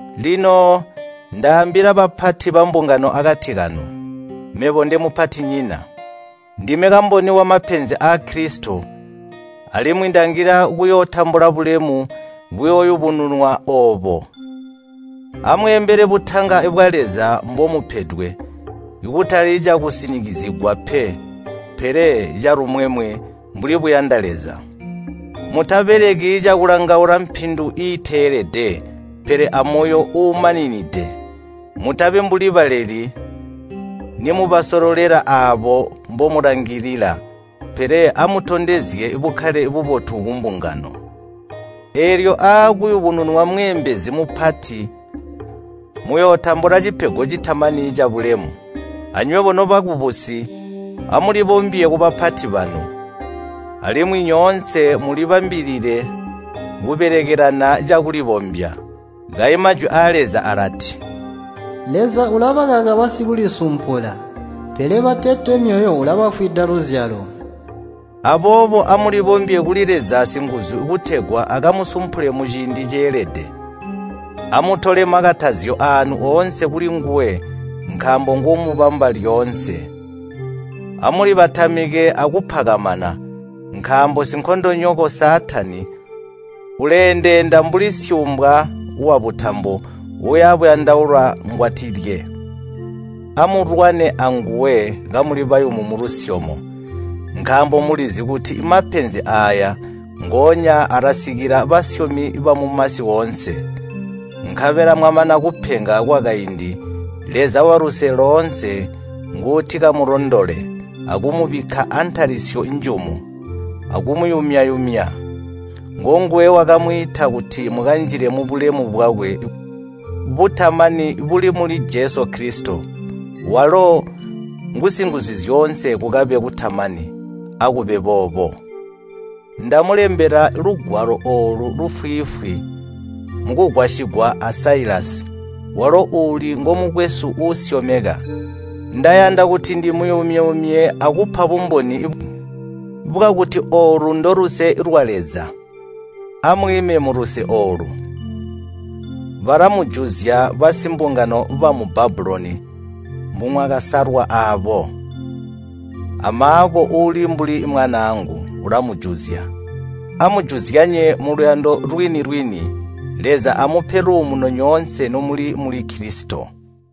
Lino ndaambila bapati bambungano akati kanu, mebo ndemupatinyina. Ndime kamboni wamapenzi aa Kilisito, alimwi ndangila kuyootambula bulemu buyooyubununwa oobo. Amweembele butanga bwa Leza mbomupedwe, kutali cakusinikizigwa pe, pele calumwemwe mbuli buyanda Leza. Mutabeleki cakulangaula mpindu iiteelede, pele amoyo uumaninide. Mutabi mbuli baleli, nimubasololela aabo mbomulangilila, pele amutondezye bukkale bubotu kumbungano. Eelyo aakuyubununwa Mweembezi mupati muyootambula cipego citamani cabulemu. Anywebo nobakubusi amulibombye kubapati banu. Alimwi nyoonse mulibambilile kubelekelana cakulibombya. Kayi Majwi aa Leza alati, “Leza ulabakaka basikulisumpula, pele batete myoyo ulabafwida luzyalo.” Aboobo amulibombye kuli Leza singuzu kutegwa akamusumpule muciindi ceelede. Amutole makatazyo aanu oonse kulinguwe nkaambo nguumubamba lyoonse. Amulibatamike akupakamana, nkaambo sinkondonyoko Saatani uleendeenda mbuli syuumbwa wabutambo uuya buyandaula ngwatilye. Amulwane anguwe kamuli bayumu mulusyomo, nkaambo mulizi kuti mapenzi aaya ngoonya alasikila basyomi bamumasi oonse. Nkabela mwamana kupenga kwakaindi, Leza waluse loonse nguutikamulondole, akumubikka antalisyo njumu, akumuyumya-yumya. Ngonguwe wakamwiita kuti mukanjile mubulemu bwakwe butamani buli muli Jesu Kilisito. Walo ngu Singuzuzyoonse kukabe kutamani. Akube boobo. Ndamulembela lugwalo oolu lufwiifwi mukugwasigwa a Siluvanasi, walo uuli ngomukwesu uusyomeka. Ndayanda kuti ndimuyumye-yumye akupa bumboni bwakuti oolu ndoluse lwa Leza. Amwiime muluse oolu. Balamujuzya basimbungano bamu Babuloni mbimwakasalwa aabo. A Maako uli mbuli mwanaangu ulamujuzya. Amujuzyanye muluyando lwini-lwini. Leza amupe luumuno nyoonse nomuli muli Kilisito.